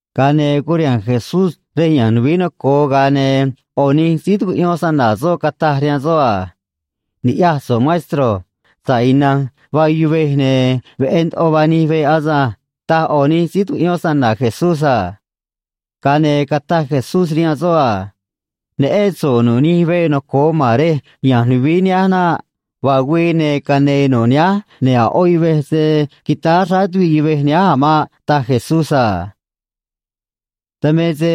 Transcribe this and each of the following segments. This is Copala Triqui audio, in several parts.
Ga̱a ne̱ curiha̱nj Jesús rej ya̱nj nuvií noco̱o, ga̱a ne̱ ꞌo̱ nij síí tucuꞌyón snana̱ soꞌ cataj rihaan soꞌ a: ―Ni̱ꞌyaj so̱ꞌ, maestro. Sa̱ꞌ ina̱nj vaa yuvej, ne̱ veꞌé ndoꞌo vaa nij veꞌ asânj ―taj ꞌo̱ nij síí tucuꞌyón snana̱ Jesús a. Ga̱a ne̱ cataj Jesús rihaan soꞌ a: ―Neꞌén so̱ꞌ nu̱ꞌ nij veꞌ noco̱o ma̱n rej ya̱nj nuvií nihánj naꞌ. Vaa güii, ne̱ cane̱e̱ nu̱ꞌ nihánj, ne̱ a̱ ꞌó yuvej se̱ quitáá xráá tuviꞌ yuvej nihánj a̱ maꞌ ―taj Jesús a. Dan me se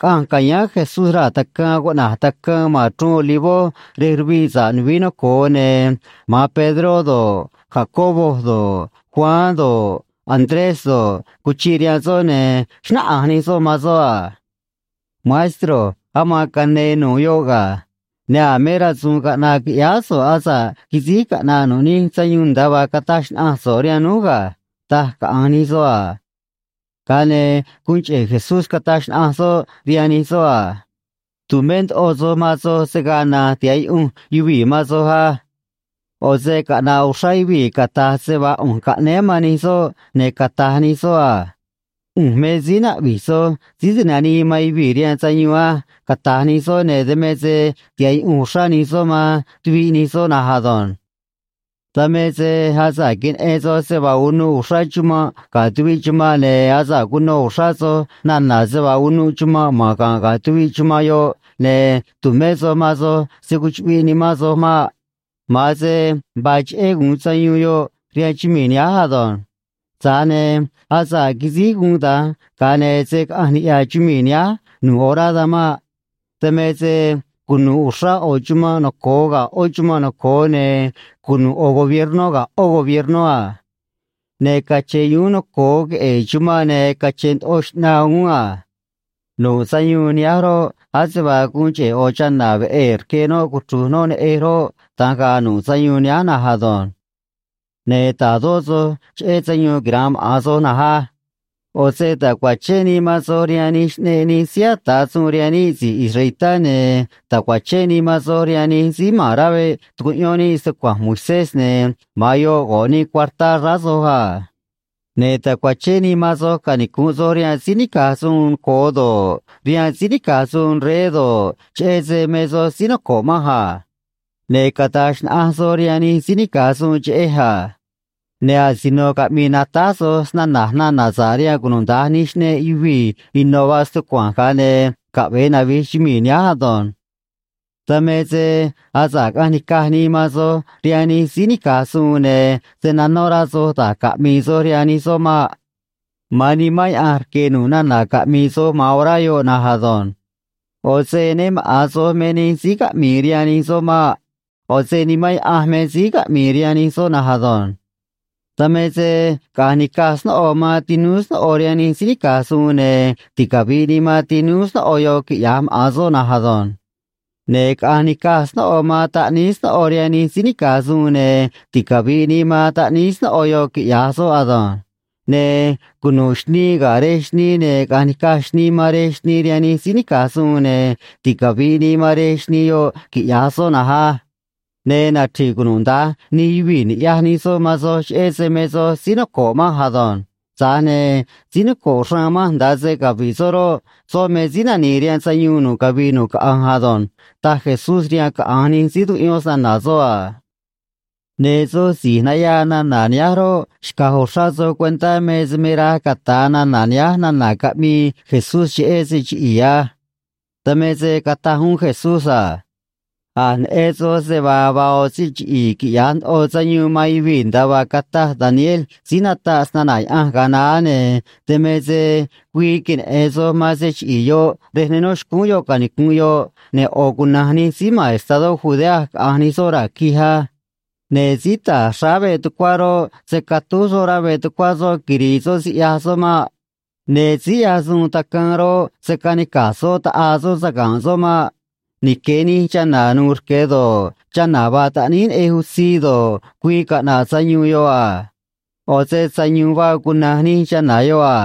caꞌanj ca̱yáán Jesús raa̱ tacaan cuꞌna̱j Tacaan ma̱n Chruun Olivó, rej ruviꞌ sa̱ꞌ nuvií noco̱o, ne̱ ma̱an Pedró do̱ꞌ, Jacobo do̱ꞌ, Juan do̱ꞌ, Andrés do̱ꞌ, cuchiꞌ rihaan soꞌ, ne̱ xnáꞌanj nij soꞌ man soꞌ a: ―Maestro, aman cane̱e̱ nu̱ꞌ yoꞌ ga̱. Ne̱ a̱ me rasu̱u̱n caꞌna̱ꞌ qui̱ꞌyáá so̱ꞌ asa̱ꞌ quisíj caꞌna̱ꞌ nu̱ꞌ nij sayuun nda̱a vaa cataj xnaꞌanj so̱ꞌ rihaan núj ga̱ ―taj caꞌa̱nj nij soꞌ a. Ga̱a ne̱ guun cheꞌe̱ Jesús cataj xnaꞌanj soꞌ rihaan nij soꞌ a: ―Tu̱mé ndoꞌo soj man soj se̱ gaa na̱nj tiha̱ꞌ yuꞌunj yuvii̱ man soj á. ꞌO̱ se caꞌna̱ꞌ uxrá yuvii̱ cata̱j se vaa ꞌu̱nj caꞌnéé man nij soꞌ ne̱ cata̱j nij soꞌ a: “ꞌU̱nj me síí naꞌvi̱j soj, Síí Ti̱nanii man Yuvii̱ rihaan Sayuun á”, cata̱j nij soꞌ, ne̱ dan me se tiha̱ꞌ yuꞌunj uxrá nij soꞌ man tuviꞌ nij soꞌ na̱nj ado̱nj. ’Dan me se asa̱ꞌ queneꞌen soj se vaa unuꞌ uxrá chumanꞌ ga̱ tuviꞌ chumanꞌ, ne̱ asa̱ꞌ cuno uxrá soj nana̱ se vaa unuꞌ chumanꞌ ma̱n ga̱nꞌ ga̱ tuviꞌ chumanꞌ yoꞌ, ne̱ tu̱mé soj man soj se̱ cuchuꞌviꞌ nimán soj maꞌ. Ma̱an se vaa cheꞌé gu̱un sayuun yoꞌ rihaan chumii̱ nihánj ado̱nj. Tza̱j ne̱ asa̱ꞌ quisíj guun da̱nj, ga̱a ne̱ se̱ caꞌanj niꞌya̱ chumii̱ nihánj nu̱ꞌ orá dan maꞌ. Dan me se cunu̱ꞌ uxrá ꞌo̱ chumanꞌ noco̱o ga̱ ꞌó chumanꞌ noco̱o, ne̱ cunu̱ꞌ ꞌo̱ gobiernó ga̱ ꞌó gobiernó a. Ne̱ cache̱n yuún noco̱o queꞌe̱e̱ chumanꞌ, ne̱ cache̱n ndoꞌo xꞌnaa uún a. Nu̱ꞌ sayuun nihánj roꞌ, ase vaa guun cheꞌe̱ ꞌo̱ chana̱ veꞌee̱ rque noꞌ cuchru̱j noꞌ neꞌej roꞌ, da̱nj ga̱a̱ nu̱ꞌ sayuun nihánj na̱nj ado̱nj. ’Ne̱ ta̱dó soj cheꞌé sayuun quira̱nꞌ maꞌa̱n soj na̱nj á. ꞌO̱ se ta̱cuachén nii man soj rihaan nij xꞌneꞌ nij síí ata̱ suun rihaan níꞌ si̱j israelitá, ne̱ ta̱cuachén nii man soj rihaan nij síí ma̱n rá veꞌ tucuꞌyón níꞌ stucua̱nj Moisés, ne̱ ma̱an yoꞌ go̱ꞌ nii cuartá xráá soj a. Ne̱ ta̱cuachén nii man soj canicu̱nꞌ soj rihaan síí nica̱j suun noco̱o do̱ꞌ, rihaan síí nica̱j suun rey do̱ꞌ, cheꞌé se me soj síí noco̱ꞌ manj a. Ne̱ cata̱j xnaꞌanj soj rihaan nij síí nica̱j suun cheꞌej a. Ne̱ asino caꞌmi̱i̱ natáj soj snana̱j nana̱ sa̱ꞌ rihaan cunuda̱nj nij xꞌneꞌ yuvii̱ ino̱ vaa stucua̱nj, ga̱a ne̱ caꞌve̱e navi̱j chumii̱ nihánj ado̱nj. ’Dan me se asa̱ꞌ caꞌa̱nj ni̱caj nii man soj rihaan nij síí nica̱j suun, ne̱ se̱ nanó rá soj da̱j caꞌmi̱i̱ soj rihaan nij soꞌ maꞌ. Ma̱an Nimán Yaꞌanj rque̱ nu̱ꞌ nana̱ caꞌmi̱i̱ soj man orá yoꞌ na̱nj ado̱nj. ꞌO̱ se né maꞌa̱n soj me nij síí caꞌmi̱i̱ rihaan nij soꞌ maꞌ. ꞌO̱ se Nimán Yaꞌanj me síí caꞌmi̱i̱ rihaan nij soꞌ na̱nj ado̱nj. Dan me se caꞌa̱nj ni̱caj snóꞌo man tinúú snóꞌo rihaan nij síí nica̱j suun, ne̱ ticavi̱ꞌ nii man tinúú snóꞌo yoꞌ, quiꞌya̱j maꞌa̱n soꞌ na̱nj ado̱nj. Ne̱ caꞌa̱nj ni̱caj snóꞌo man taꞌníí snóꞌo rihaan nij síí nica̱j suun, ne̱ ticavi̱ꞌ nii man taꞌníí snóꞌo yoꞌ, quiꞌya̱j soꞌ ado̱nj. Ne̱ cunu̱ꞌ xnii ga̱ rej xnii, ne̱ caꞌa̱nj ni̱caj xnii man rej xnii rihaan nij síí nica̱j suun, ne̱ ticavi̱ꞌ nii man rej xnii yoꞌ, quiꞌya̱j soꞌ na̱nj á. Ne̱ nachri̱ꞌ cunuda̱nj nij yuvii̱ ni̱ꞌyaj nij soꞌ man soj, cheꞌé se me soj síí noco̱ꞌ manj ado̱nj. Tza̱j ne̱ síí noco̱ꞌ xraan manj nda̱a se cavi̱ꞌ soꞌ roꞌ, soꞌ me síí nani̱i̱ rihaan sayuun nu̱ꞌ cavii nu̱ꞌ caꞌanj ado̱nj ―taj Jesús rihaan caꞌa̱nj nij síí tucuꞌyón snana̱ soꞌ a. Ne̱ soj si̱j nayaa nana̱ nihánj roꞌ, xca̱j uxrá soj cuentá me se me raj cata̱a nana̱ nihánj nana̱ caꞌmii Jesús cheꞌé se chiꞌi̱i̱ á. Dan me se cataj uún Jesús a: ―A̱j neꞌen soj se vaa vaa ꞌo̱ se chiꞌi̱i̱ quiꞌya̱j ndoꞌo sayuun man yuvii̱, nda̱a vaa cataj Daniel síí nataꞌ snana̱ Yaꞌanj ga̱a naá, ne̱ dan me se güii queneꞌe̱n soj man se chiꞌi̱i̱ yoꞌ rej ne nó xcúún yoꞌ canicu̱nꞌ yoꞌ, ne̱ ꞌo̱ cuna̱nj nij síí ma̱n estadó Judea caꞌa̱nj nij soꞌ raa̱ quij á. Ne̱ síí ta̱j xráá veꞌ tucuá roꞌ, se̱ catúj soꞌ rá veꞌ tucuá soꞌ quiri̱i̱ soꞌ siꞌyaj soꞌ maꞌ. Ne̱ síí ꞌyaj suun tacaan roꞌ, se̱ canica̱j soꞌ ta̱ꞌaa soꞌ saga̱nꞌ soꞌ maꞌ. Nique̱ nij chana̱ nu̱u̱ rque do̱ꞌ, chana̱ vaa taꞌníí neꞌej utzii do̱ꞌ, güii caꞌna̱ꞌ sayuun yoꞌ a. ꞌO̱ se sayu̱u̱n vaa cuna̱nj nij chana̱ yoꞌ a.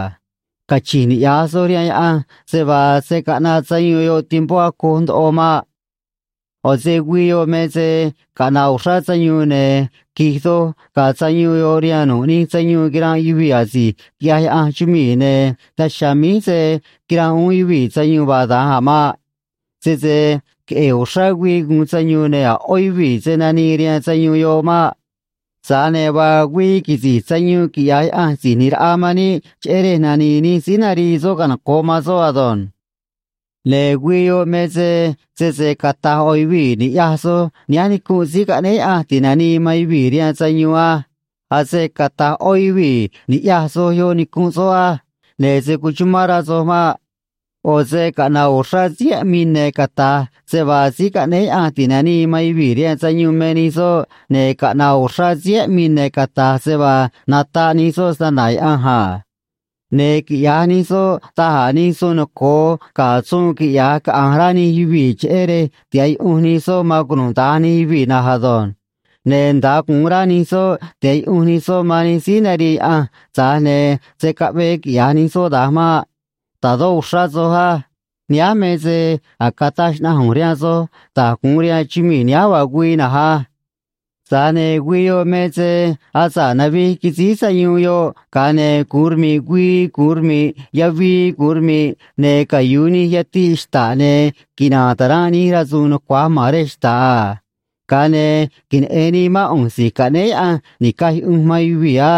Cachi̱nj niꞌya̱j soj rihaan Yaꞌanj se vaa se̱ caꞌnaꞌ sayuun yoꞌ tiempó acoj ndoꞌo maꞌ. ’ꞌO̱ se güii yoꞌ me se caꞌna̱ꞌ uxrá sayuun, ne̱ qui̱j doj ga̱a̱ sayuun yoꞌ rihaan nu̱ꞌ nij sayuun quiranꞌ yuvii̱ asi̱j quiꞌyaj Yaꞌanj chumii̱, ne̱ daj chiha̱a̱ míj se̱ quiranꞌ uún yuvii̱ sayuun vaa da̱nj a̱ maꞌ. Sese queꞌe̱e̱ uxrá güii gu̱un sayuun, ne̱ a̱ ꞌó yuvii̱ se̱ nanii rihaan sayuun yoꞌ maꞌ. Tza̱j ne̱ vaa güii quisi̱j sayuun, quiꞌya̱j Yaꞌanj Si̱j ꞌNi̱j Raꞌa man níꞌ, cheꞌé rej nani̱i̱ nij síí narii soꞌ canoco̱ꞌ man soꞌ ado̱nj. ’Ne̱ güii yoꞌ me se sese cata̱j ꞌo̱ yuvii̱, “Ni̱ꞌyaj soj; nihánj nicunꞌ Síí Caꞌnéé Yaꞌanj Ti̱nanii man Yuvii̱ rihaan Sayuun á”, ase cata̱j ꞌó yuvii̱, “Ni̱ꞌyaj soj; yoꞌ nicunꞌ soꞌ á”, ne̱ se̱ cuchumán rá soj maꞌ. ꞌO̱ se caꞌna̱ꞌ uxrá síí aꞌmii ne̱ cata̱j se vaa Síí Caꞌnéé Yaꞌanj Ti̱nanii man Yuvii̱ rihaan Sayuun me nij soꞌ, ne̱ caꞌna̱ꞌ uxrá síí aꞌmii ne̱ cata̱j se vaa nataꞌ nij soꞌ snana̱ Yaꞌanj a. Ne̱ quiꞌya̱j nij soꞌ da̱j a̱ nij suun noco̱o ga̱ suun quiꞌya̱j caꞌa̱nj rá nij yuvii̱, cheꞌé rej tiha̱ꞌ yuꞌunj nij soꞌ man cunuda̱nj nij yuvii̱ na̱nj ado̱nj. Ne̱ nda̱a gu̱un rá nij soꞌ tiha̱ꞌ yuꞌunj nij soꞌ man nij síí narii Yaꞌanj, tza̱j ne̱ se̱ caꞌve̱e quiꞌya̱j nij soꞌ da̱nj maꞌ. Ta̱dó uxrá soj á. Nihánj me se a̱j cataj xnaꞌanj ꞌu̱nj rihaan soj da̱j gu̱un rihaan chumii̱ nihánj vaa güii na̱nj á. ’Tza̱j ne̱ güii yoꞌ me se asa̱ꞌ navij quisíj sayuun yoꞌ, ga̱a ne̱ gu̱un rmi̱ꞌ güii gu̱un rmi̱ꞌ yavii gu̱un rmi̱ꞌ, ne̱ cayu̱u nij yatiꞌ xta̱ꞌ, ne̱ quina̱a̱n ta̱ranꞌ nij rasu̱u̱n nucua̱j ma̱n rej xta̱ꞌ a. Ga̱a ne̱ queneꞌe̱n nii mán ꞌu̱nj Si̱j Caꞌnéé Yaꞌanj Ni̱caj Yuꞌunj man Yuvii̱ á.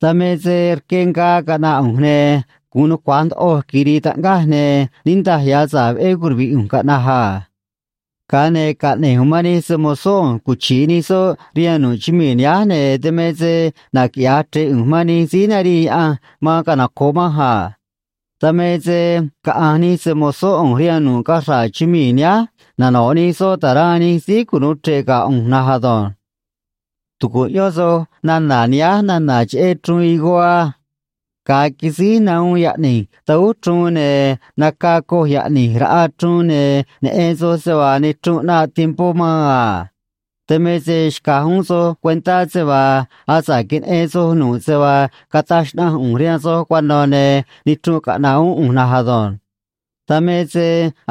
Dan me se rque ngaa caꞌna̱ꞌ ꞌu̱nj, ne̱ gu̱un nucua̱j ndoꞌoj quiri̱i̱ taꞌngaj, ne̱ niꞌndaj ya̱ sa̱ꞌ veꞌé curuvi̱ꞌ ꞌu̱nj caꞌna̱j a. Ga̱a ne̱ caꞌne̱j ꞌu̱nj man nij se‑mo̱zó ꞌu̱nj cuchi̱ꞌ nij soꞌ rihaan nu̱ꞌ chumii̱ nihánj, ne̱ dan me se naquiꞌya̱j chre̱ꞌ ꞌu̱nj man nij síí narii Yaꞌanj man canoco̱ꞌ manj a. Dan me se caꞌa̱nj nij se‑mo̱zó ꞌu̱nj rihaan nu̱ꞌ cachra̱ꞌ chumii̱ nihánj, nano̱ꞌ nij soꞌ ta̱ranꞌ nij síí cunu̱u chre̱ꞌ ga̱ ꞌu̱nj na̱nj ado̱nj. ’Tu̱cuꞌyón soj nana̱ nihánj nana̱ cheꞌé chruun higó á. Ga̱a quisíj nahuun yaꞌni̱j tahúj chruun, ne̱ naca coj yaꞌni̱j raꞌa chruun, ne̱ neꞌen soj se vaa nichrunꞌ ꞌnaꞌ tiempó maan a. Dan me se xca̱j uún soj cuentá se vaa asa̱ꞌ queneꞌen soj nu̱ꞌ se vaa cataj xnaꞌanj ꞌu̱nj rihaan soj cuano̱, ne̱ nichrunꞌ caꞌna̱ꞌ uún ꞌu̱nj na̱nj ado̱nj. Dan me se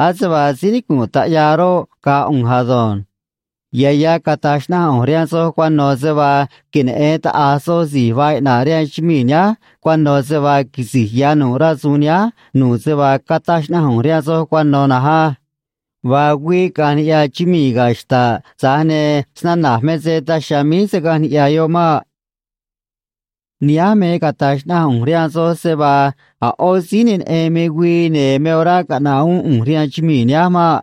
ase vaa síí nicu̱nꞌ taꞌyaa roꞌ, ga̱a̱ ꞌu̱nj ado̱nj. Ya̱ ya̱ cata̱j xnaꞌanj ꞌu̱nj rihaan soj cuano̱ se vaa queneꞌe̱n taꞌa̱j soj si̱j vaa iꞌna̱ꞌ rihaan chumii̱ nihánj cuano̱ se vaa quisi̱j ya̱ nu̱ꞌ rasu̱u̱n nihánj nu̱ꞌ se vaa cataj xnaꞌanj ꞌu̱nj rihaan soj cuano̱ na̱nj á. Vaa güii caꞌa̱nj niꞌya̱ chumii̱ ga̱ xta̱ꞌ, tza̱j ne̱ snana̱j me se daj chiha̱a̱ míj se̱ caꞌanj niꞌya̱ yoꞌ maꞌ. ’Nihánj me cata̱j xnaꞌanj ꞌu̱nj rihaan soj se vaa a̱ ꞌó síí ne neꞌen me güii ne̱ me orá caꞌna̱ꞌ uún ꞌu̱nj rihaan chumii̱ nihánj maꞌ.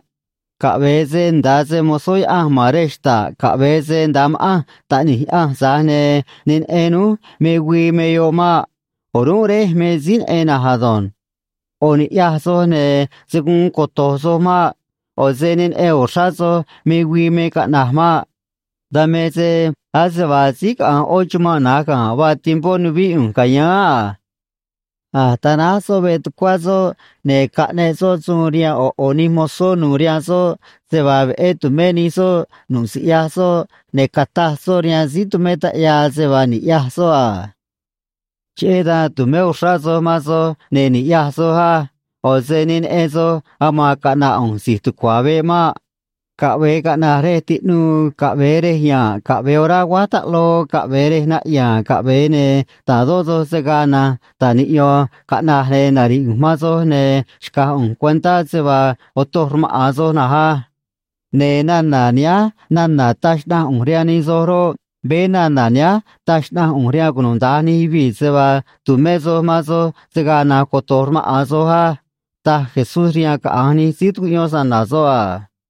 Caꞌve̱e se nda̱a se‑mo̱zó Yaꞌanj ma̱n rej xta̱ꞌ, caꞌve̱e se nda̱a ma̱ꞌanj Taꞌni̱j Yaꞌanj, tza̱j ne̱ ne neꞌen núj me güii me yoꞌ maꞌ. O̱rúnꞌ Réj me síí neꞌen na̱nj ado̱nj. ꞌO̱ ni̱ꞌyaj soj, ne̱ se̱ guun coto̱j soj maꞌ. ꞌO̱ se ne neꞌen uxrá soj me güii me caꞌna̱j maꞌ. Dan me se ase vaa síí caꞌa̱nj ꞌó chumanꞌ na̱j ga̱nꞌ vaa tiempó nuvíꞌ ꞌu̱nj ca̱yáán a. A̱j tanáj soꞌ veꞌ tucuá soꞌ, ne̱ caꞌneꞌ soꞌ suun rihaan ꞌo̱ ꞌo̱ nij mozó nu̱u̱ rihaan soꞌ se vaa veꞌé tu̱mé nij soꞌ nu̱ꞌ siꞌyaj soꞌ, ne̱ cataj soꞌ rihaan síí tumé taꞌyaa se vaa ni̱ꞌyaj soꞌ a. Cheꞌé dan tu̱mé uxrá soj man soj, ne̱ ni̱ꞌyaj soj á. ꞌO̱ se ne neꞌen soj aman caꞌna̱ꞌ ꞌu̱nj si̱j tucua̱ veꞌ maꞌ. Caꞌve̱e caꞌna̱j rej tiꞌnuu, caꞌve̱e rej ya̱nꞌ, caꞌve̱e orá aguáj taꞌloo caꞌve̱e rej naꞌya̱a̱n caꞌve̱e, ne̱ ta̱dó soj se̱ gaa na̱nj ta̱j niꞌyo̱n caꞌna̱j ne̱ nari̱ꞌ ꞌu̱nj man soj ne̱ xca̱j ꞌu̱nj cuentá se vaa otoj rmaꞌa̱n soj na̱nj á. Ne̱ nana̱ nihánj nana̱ taj xnaꞌanj ꞌu̱nj rihaan nij soj roꞌ, veé nana̱ nihánj taj xnaꞌanj ꞌu̱nj rihaan cunuda̱nj nij yuvii̱, se vaa tu̱mé soj man soj se̱ gaa na̱nj coto̱j rmaꞌa̱n soj á ―taj Jesús rihaan caꞌa̱nj nij síí tucuꞌyón snana̱ soꞌ a.